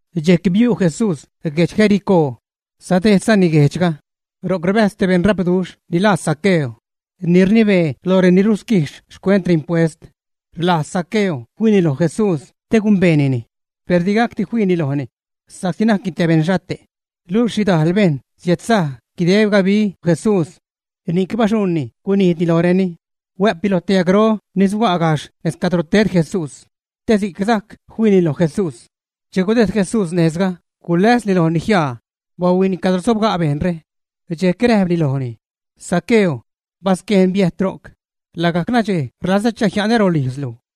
Dxejc biu' Jesús guedx Jericó, sadejdzani guejdxga. Ro'c rbäjz te beṉrapduxh, ni laa Zaqueo, ni rnibee lo reni rusquijx xcuent impuest. Rlajz Zaqueo fiini loj Jesús te gumbeenini, per digacdi fiini lojni sa'csi najcni te beṉxhate', luxh xhidajl bejṉ siädsaj guideb gabi Jesús. Ni'c baxuṉni gunijdni lojreni, huä'pni lo te yajgro ni suga' gajxh nez cadro ted Jesús te si'c sajc fiini loj Jesús. Che gudejd Jesús nejzga, guläsni lojni jiaa, bahuiini cadro sobga' bejṉre. Dxejc räjpni lojni: ―Zaqueo, basquejn biäjt ro'c, lagajc nadxej rlazä chajia'nä rolijzlu.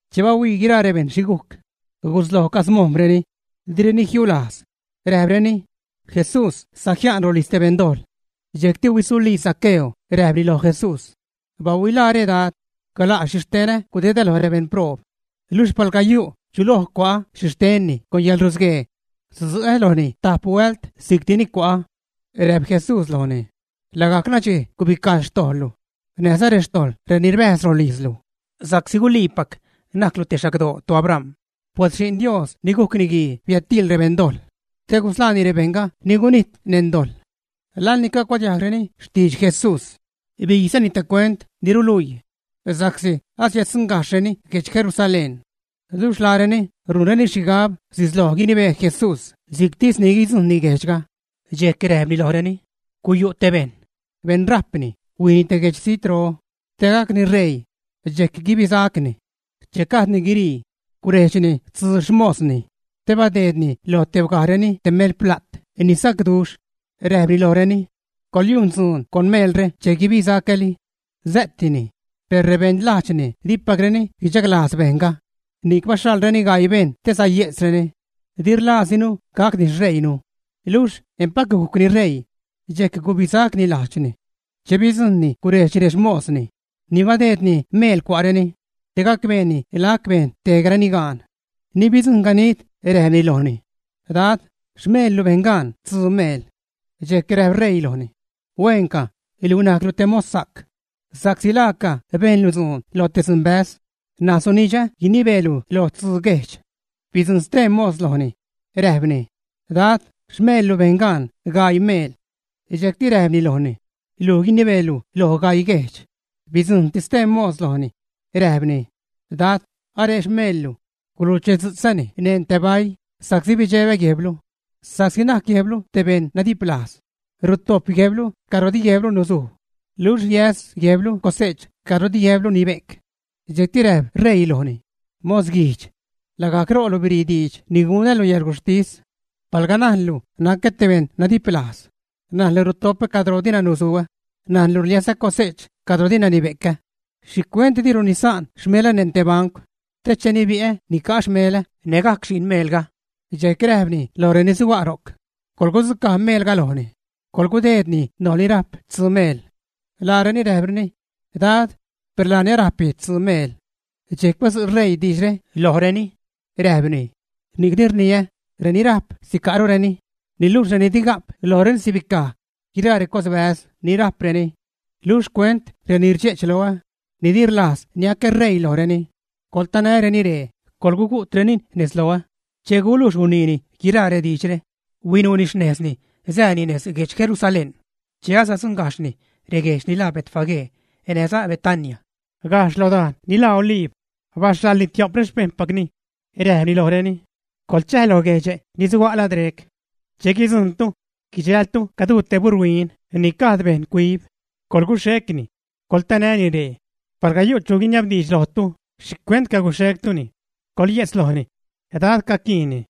Che bahuii guiraa rebejṉ xhi gujc, gusloj camojm̲reni, direni jiulajz, räjpreni: ―Jesús sajia'n rolijz te beṉdojḻ. Dxejcti huisulii Zaqueo, räjpni loj Jesús: ―Bahuilaare, Dad, gala' xhixtenä gudedä loj rebeṉproob; luxh palga yu' chu loj cua'ä xhixtenni con yäḻrusguee, sudzu'ä lojni tajp huält si'cti ni cua'ä. Räjp Jesús lojni: ―Lagajc nadxej gubicaj xtojḻlu näjza xtojḻ reni rbäjz rolijzlu, sa'csi guliipac najclu te xagdoo toAbram. Pues Xi'n Dios ni gujc Niguii biädtiil rebeṉdojḻ te gusḻaani rebejṉga ni gunijt neṉ dojḻ. Laḻ ni cagucuadiajgreni xtidx Jesús, bijzani te cuent ni ruluii, sa'csi asiäddzujṉgajxhreni guedx Jerusalén, luxh laareni rujnreni xhigab sisloj guinibee Jesús si'ctisni guidzujṉni guejdxga. Dxejc räjpni lojreni: ―Guyu' te bejṉ, beṉrajpni, huijni te guejdx zijtro te gacni ṟeii, dxejc guibisacni. Che gajdni guirii, gurejdxni tzuu xmosni, te badeedni lo tebgajreni te melpla't ni sacduxh, räjpni lojreni: “Coḻyujn dzuun con meelre che guibisacäli.” Sä'tini. Per rebeṉ lajdxni dipacreni guichaglajz bejṉga, ni'c baxhaḻreni gaii bejṉ te saye'tzreni: “Di rlajzdinu gacni xṟeiinu.” Luxh empac gujcni ṟeii, dxejc gubisacni lajdxni. Che bidzujṉni gurejdxni rexmosni ni badeedni meel cua'reni, te gacbeeni lac bejn tejgareni gaan. Ni bidzujṉ ganid räjpni lojni: “Dad, xmeellu bejn gaan stzuu meel.” Dxejc räjp ṟeii lojni: “Hueenca, luj najclu te mossa'c, sa'csi laaca bejnlu dzuun lo te dzunbäz, ṉaj sunidxä guinibeelu loj tzuu guejdx.” Bidzujṉ stee mos lojni, räjpni: “Dad, xmeellu bejn gaan gaii meel.” Dxejcti räjpni lojni: “Luj guinibeelu loj gaii guejdx.” Bidzujṉti stee mos lojni, räjpni: “Dad, aree xmeellu, guluchedzu'tzäni neṉ te baii sa'csi bidxebä guejblu, sa'csi najc guejblu te beṉ nadiplajz, rutojp guejblu cadro di guejblu nuzuj, luxh rliäs guejblu cose'ch cadro di guejblu nibe'c.” Dxejcti räjp ṟeii lojni: “¡Mosguijdx! lagajc ro'lu birii diidx ni gunälu yäḻguxhtis. Palga najnlu nacä te beṉ nadiplajz, najnlu rutopä cadro dina nusuä, najnlu rliäsä cose'ch cadro dina nibe'cä, ¿xhicuent dilu nisa'n xmelä neṉ te bancw te che nibi'ä nica'a xmelä nägajc xi'n meelga?” Dxejc räjpni loj reni suga' ro'c: “Coḻgudzucaj meelga lojni, coḻgudeedni loj ni rajp tzuu meel.” Laareni räjpreni: “Dad, per laani arajpni tzuu meel.” Dxejc badzu' ṟeii diidxre lojreni, räjpni: “Ni'cni rniä, reni rajp, sica'rureni, niluxh reni di ga'p lojreni sibicaj guiraa recosbäz ni rajpreni. Luxh xcuent reni rdxe'ch loä, ni di rlajz niacä ṟeii lojreni, coḻtanäreni ree, coḻgugu'treni nez loä.” Che gulujx guniini guiraa rediidxre, huinuuni xnejzni, sääni nez lo guejdx Jerusalén. Che asadzuṉgajxhni reguejdx ni laa Betfagé näjza Betania, gajxh lo dajn ni laa Oliib, baxhaḻni tio'p rexpejṉpacni, räjpni lojreni: ―Coḻchäj lo guejdxe' ni suga' lad rec. Che guidzujṉtu, guidxältu caduu te buṟ huin ni gajd bejṉ cuib. Coḻguxhecni, coḻtanäni ree. Palga yu' chu guiniabdiidx lojtu: “¿Xhicuent caguxhectuni?” coḻye'tz lojni: “Dad caquiinnini.”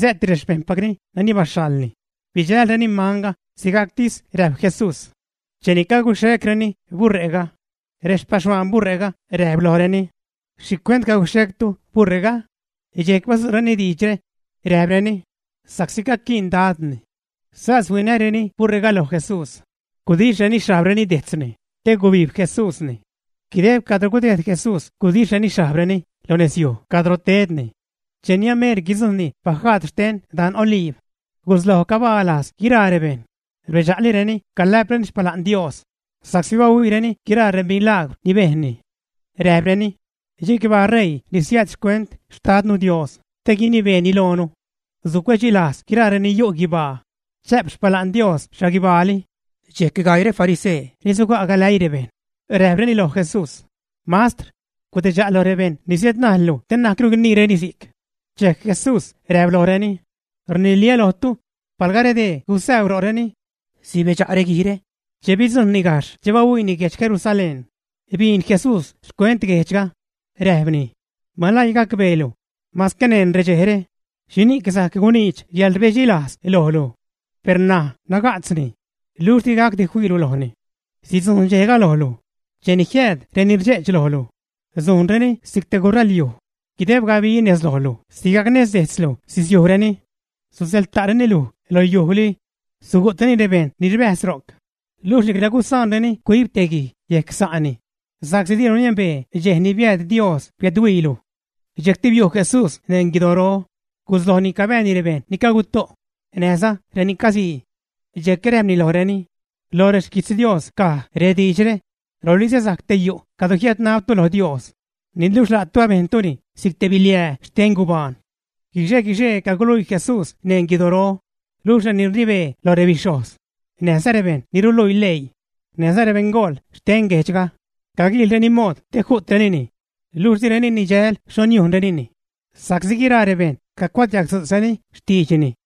Sä'ti rexpejṉpacni nani baxhaḻni, bidxälreni manga sigajctisni räjp Jesús. Cheni caguxhecreni buṟe'ga, rexpaxhuaan buṟe'ga räjp lojreni: ―¿Xhicuent caguxhectu buṟe'ga, ä? Dxejc badzu'reni diidxre, räjpreni: ―Sa'csi caquiin Dadni. Sas huinäreni buṟe'ga loj Jesús, gudixhreni xhajbreni dejtzni, te gubijb Jesúsni. Guideb cadro gudejd Jesús gudixhreni xhajbreni lo nezyuj cadro tedni. Cheni ameer guidzujṉni bajaad xten dan Oliib, gusloj cabaa lajz guiraa rebejṉ, rbedxa'lireni calä'preni xpala'n Dios sa'csi bahuiireni guiraa remilagwr ni bejnni. Räjpreni: Chicbaa ṟeii ni siääd xcuent Xtadnu Dios te guinibeeni loonu. Sucuedxilajz guiraa reni yu' guibaa, chä'p xpala'n Dios xhaguibaali. Dxejc gaii refarisee ni suga' galäii rebejṉ, räjpreni loj Jesús: ―Mastr, gudidxa' lo rebejṉ ni siädnajllu te na'cru guiniireni si'c. Dxejc Jesús räjp lojreni: ―Rniliä́ lojtu, palga redee gusäu ro'reni, sibedxa' reguijre. Che bidzujṉni gajxh, che bahuiini guedx Jerusalén, biin Jesús xcuent guejdxga, räjpni: ―¡Maläii gacbeelu, masque neṉ redxejre, xhini'c sajc guniidx yäḻrbedxilajz lojlu! Per ṉaj naga'tzni, luxh digacdi fiilu lojni. Sidzujṉ dxejga lojlu, cheni jiääd reni rdxe'ch lojlu sujnreni si'c te guṟalyuj guideb gabilu, nez lojlu sigajc nez dejtzlu sisiujreni. Susäḻta'reni luj lo yujli. Sugu'treni rebejṉ ni rbäjz ro'c, luxh nicla gusaanreni cuib te guij yejc sa'ni sa'csi dilu niembee dxej ni biääd Dios biädhuiilu. Dxejcti biu' Jesús neṉ guidoro, guslojni cabääni rebejṉ ni caguto' näjza reni casii. Dxejc räjpni lojreni: ―Loj rexquijtz Dios caj rediidxre: “Rolizä sajc te yu' cadro jiädnabtu lo Dios”, niluxh la'tu abejntuni si'c te biliää xte gubaan. Guixe-guixee caguluii Jesús neṉ guidoro, luxh reni rnibee loj rebixhojz näjza rebejṉ ni ruluii leii, näjza rebeṉgool xte guejdxga caguiilreni mood te ju'trenini, luxh direni nidxäjl xho niujnrenini sa'csi guiraa rebejṉ cacuadiagdzu'tzreni xtiidxni.